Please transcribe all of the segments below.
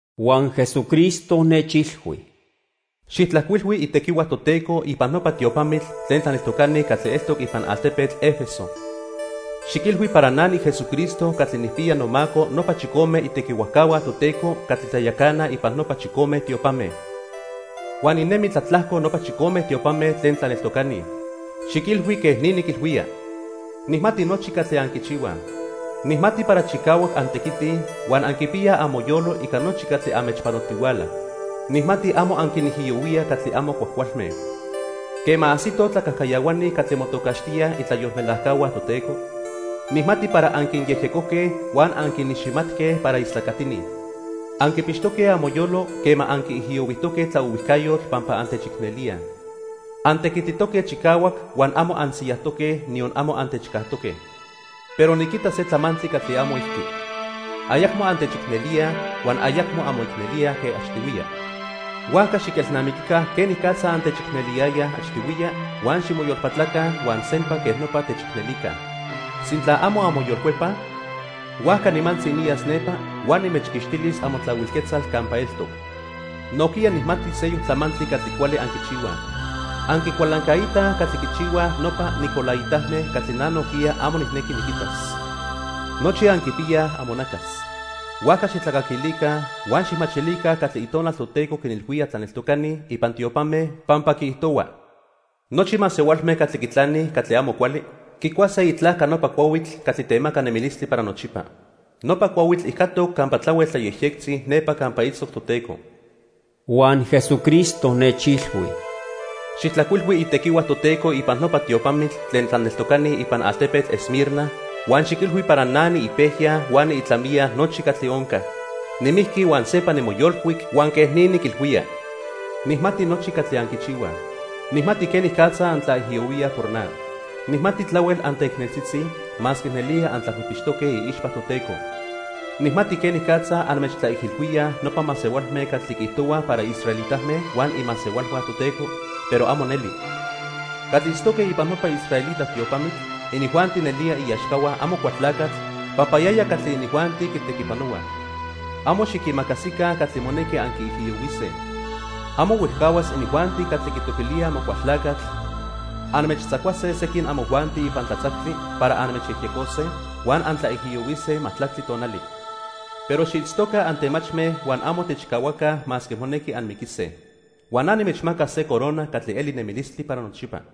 Huan Jesucristo nechilhui: "Xijtlajcuilhui itequihua Toteco ipan nopa tiopamitl tlen tlaneltocani catli eltoc ipan altepetl 'Efeso. Xiquilhui para na niJesucristo catli nijpiya nomaco nopa chicome itequihuajcahua Toteco catli tlayacanaj ipan nopa chicome tiopame. Huan ninemi tlatlajco nopa chicome tiopame tlen tlaneltocani. Xiquilhui quej ni niquilhuía: Nijmati nochi catli anquichihuaj. Nijmati para chicahuac antequitij huan anquipiyaj amoyolo ica nochi catli anmechpanotihuala. Nijmati amo anquinijiyohuíaj catli amo cuajcualme. Quema ajsitoj tlacajcayahuani catli motocaxtíaj itlayolmelajcahua Toteco, nijmati para anquinyejyecojque huan anquiniximatque para istlacatini. Anquipixtoque amoyolo quema anquiijiyohuijtoque tlaohuijcayotl pampa antechicnelíaj. Antequititoque chicahuac huan amo ansiyajtoque, niyon amo antechcajtoque. Pero niquita se tlamantli catli amo ijqui. Ayacmo antechicnelíaj huan ayacmo anmoicnelíaj quen achtihuiya. Huajca xiquelnamiquica quenicatza antechicneliyayaj achtihuiya huan ximoyolpatlaca huan sempa quej nopa techicnelica. Sintla amo anmoyolcuepaj, huajca nimantzi niyas nepa huan nimechquixtilis amotlahuil quetzal campa eltoc. Nojquiya nijmati seyoc tlamantli catli cuali anquichihuaj. Anquicualancaitaj catli quichihuaj nopa nicolaitame catli na nojquiya amo nijnequi niquitas. Nochi anquipiyaj amonacas, huajca xijtlacaquilica huan xijmachilica catli Itonal Toteco quinilhuía tlaneltocani ipan tiopame, pampa quiijtohua: Nochi masehualme catli quitlanij catli amo cuali quicuase itlajca nopa cuahuitl catli temaca nemilistli para nochipa. Nopa cuahuitl ijcatoc campa tlahuel tlayejyectzi nepa campa itztoc Toteco." Huan Jesucristo nechilhui: "Xijtlajcuilhui itequihua Toteco ipan nopa tiopamitl tlen tlaneltocani ipan altepetl Esmirna huan xiquilhui para na niipejya huan niitlamiya nochi catli onca. Nimijqui huan sempa nimoyolcuic huan quej ni niquilhuía: Nijmati nochi catli anquichihuaj. Nijmati quenicatza antlaijiyohuíaj por na. Nijmati tlahuel anteicneltzitzi, masque nelía antlapijpixtoque iixpa Toteco. Nijmati quenicatza anmechtlaijilhuíaj nopa masehualme catli quiijtohuaj para israelitame huan imasehualhua Toteco, pero amo neli. Catli itztoque ipan nopa israelita tiopamitl, inijuanti nelía iaxcahua Amocualtlacatl pampa yaya catli inijuanti quitequipanohuaj. Amo xiquimacasica catli monequi anquiijiyohuise. Amo huejcahuas inijuanti catli quitoquilíaj Amocualtlacatl anmechtzacuase sequin amojuanti ipan tlatzactli para anmechyejyecose, huan antlaijiyohuise majtlactli tonali. Pero xiitztoca antemachme huan amo techcahuaca masque monequi anmiquise. Huan na nimechmacas se corona catli eli nemilistli para nochipa.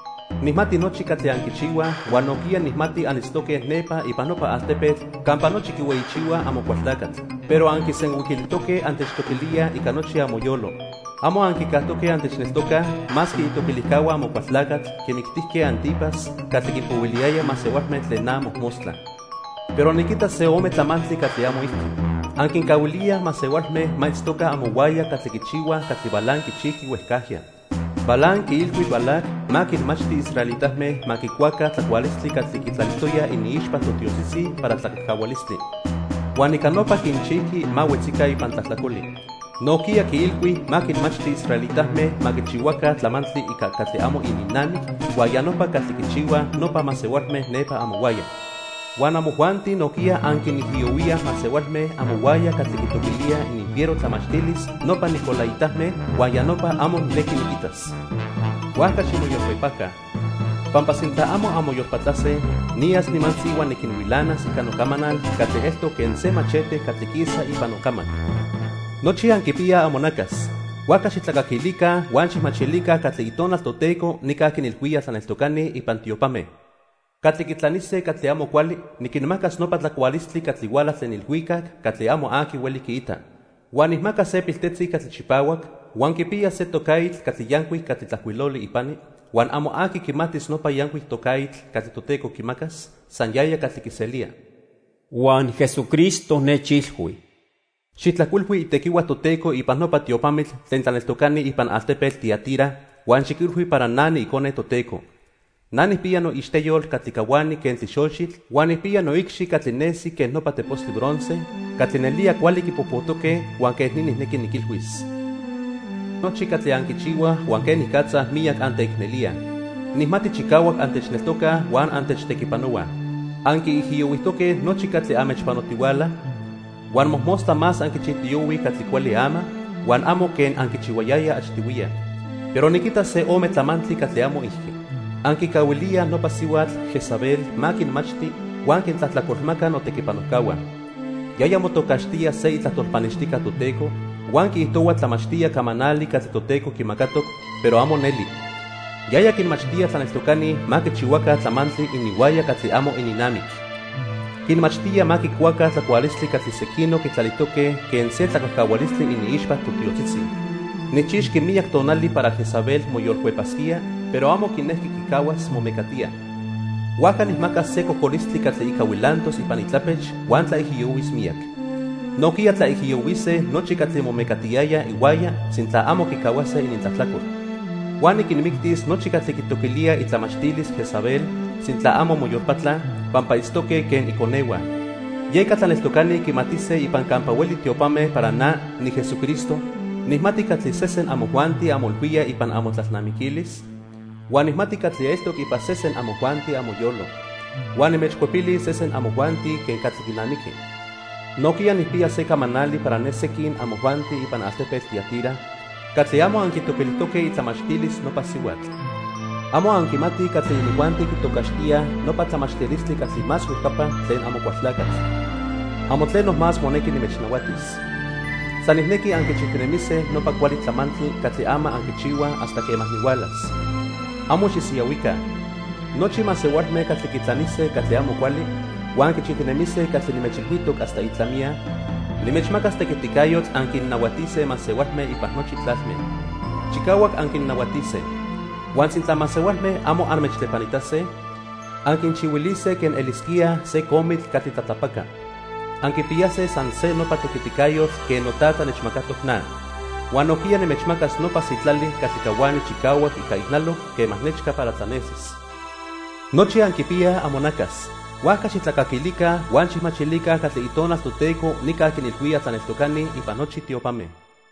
Nijmati nochi catli anquichihuaj huan nojquiya nijmati anitztoque nepa ipan nopa altepetl campa nochi quihueyichihuaj Amocualtlacatl. Pero anquisenhuiquilijtoque antechtoquilíaj ica nochi amoyolo. Amo anquicajtoque antechneltocaj masque itoquilijcahua Amocualtlacatl quimictijque 'Antipas catli quinpohuiliyaya masehualme tlen na mojmostla. Pero niquita se ome tlamantli catli amo ijqui. Anquincahuilíaj masehualme ma itztoca amohuaya catli quichihuaj catli Balaam quichijqui huejcajya. Balaam quiilhui Balac ma quinmachti israelitame ma quicuaca tlacualistli catli quitlalijtoyaj iniixpa totiotzitzi para tlacajcahualistli. Huan ica nopa quinchijqui ma huetzica ipan tlajtlacoli. Nojquiya quiilhui ma quinmachti israelitame ma quichihuaca tlamantli ica catli amo ininnamic, huan ya nopa catli quichihuaj nopa masehualme nepa amohuaya. Huan amojuanti nojquiya anquinijiyohuíaj masehualme amohuaya catli quitoquilíaj ininfiero tlamachtilis nopa nicolaitame huan ya nopa amo nijnequi niquitas. Huajca ximoyolcuepaca, pampa sintla amo anmoyolpatlase, niyas nimantzi huan niquinhuilanas ica nocamanal catli eltoc quen se machete catli quisa ipan nocamac. Nochi anquipiyaj amonacas, huajca xijtlacaquilica huan xijmachilica catli Itonal Toteco nica quinilhuía tlaneltocani ipan tiopame. Catli quitlanise catli amo cuali niquinmacas nopa tlacualistli catli huala tlen ilhuicac catli amo aqui hueli quiita. Huan nijmacas se piltetzi catli chipahuac huan quipiyas se tocaitl catli yancuic catli tlajcuiloli ipani huan amo aqui quimatis nopa yancuic tocaitl catli Toteco quimacas, san yaya catli quiselía." Huan Jesucristo nechilhui: "Xijtlajcuilhui itequihua Toteco ipan nopa tiopamitl tlen tlaneltocani ipan altepetl Tiatira huan xiquilhui para na niIcone Toteco. Na nijpiya noixteyol catli cahuani quen tlixochitl huan nijpiya noicxi catli nesi quen nopa tepostli bronce catli nelía cuali quipojpojtoque huan quej ni nijnequi niquilhuis: Nijmati nochi catli anquichihuaj huan quenicatza miyac anteicnelíaj. Nijmati chicahuac antechneltocaj huan antechtequipanohuaj. Anquiijiyohuijtoque nochi catli anmechpanotihuala, huan mojmostla más anquichijtiyohuij catli cuali ama huan amo quen anquichihuayayaj achtihuiya. Pero niquita se o ome tlamantli catli amo ijqui. Anquicahuilíaj nopa sihuatl Jezabel ma quinmachti huan quintlajtlacolmaca notequipanojcahua. Yaya motocaxtía se itlajtol pannextijca Toteco huan quiijtohua tlamachtía camanali catli Toteco quimacatoc, pero amo neli. Yaya quinmachtía tlaneltocani ma quichihuaca tlamantli ininhuaya catli amo ininnamic. Quinmachtía ma quicuaca tlacualistli catli sequinoc quitlalijtoque quen se tlacajcahualistli iniixpa totiotzitzi. Nijchixqui miyac tonali para Jezabel moyolcuepasquía, pero amo quinequi quicahuas momecatía. Huajca nijmacas se cocolistli catli ica huilantos ipan itlapech huan tlaijiyohuis miyac. Nojquiya tlaijiyohuise nochi catli momecatiyayaj ihuaya sintla amo quicahuase inintlajtlacol. Huan niquinmictis nochi catli quitoquilíaj itlamachtilis Jezabel, sintla amo moyolpatlaj, pampa itztoque quen iconehua. Yeca tlaneltocani quimatise ipan campa hueli tiopame para na, niJesucristo, nijmati catli sesen amojuanti anmoilhuíaj ipan amotlalnamiquilis huan nijmati catli eltoc ipan sesen amojuanti amoyolo. Huan nimechcuepilis sesen amojuanti quen catli quinamiqui. Nojquiya nijpiya se camanali para ne sequin amojuanti ipan altepetl Tiatira catli amo anquitoquilijtoque itlamachtilis nopa sihuatl. Amo anquimatij catli inijuanti quitocaxtíaj nopa 'tlamachtilistli catli más huejcapa' tlen Amocualtlacatl. Amo tleno más monequi nimechnahuatis. San nijnequi anquichijtinemise nopa cuali tlamantli catli ama anquichihuaj hasta quema nihualas. Amo xisiyahuica. Nochi masehualme catli quitlanise catli amo cuali huan quichijtinemise catli nimechilhuijtoc hasta itlamiya, nimechmacas tequiticayotl anquinnahuatise masehualme ipan nochi tlalme. Chicahuac anquinnahuatise. Huan sintla masehualme amo anmechtlepanitase, anquinchihuilise quen elisquíaj se comitl catli tlatlapaca. Anquipiyase san se nopa tequiticayotl quen noTata nechmacatoc na. Huan nojquiya nimechmacas nopa sitlali catli cahuani chicahuac ica ijnaloc quema nechca para tlanesis. Nochi anquipiyaj amonacas, huajca xijtlacaquilica huan xijmachilica catli Itonal Toteco nica quinilhuía tlaneltocani ipan nochi tiopame."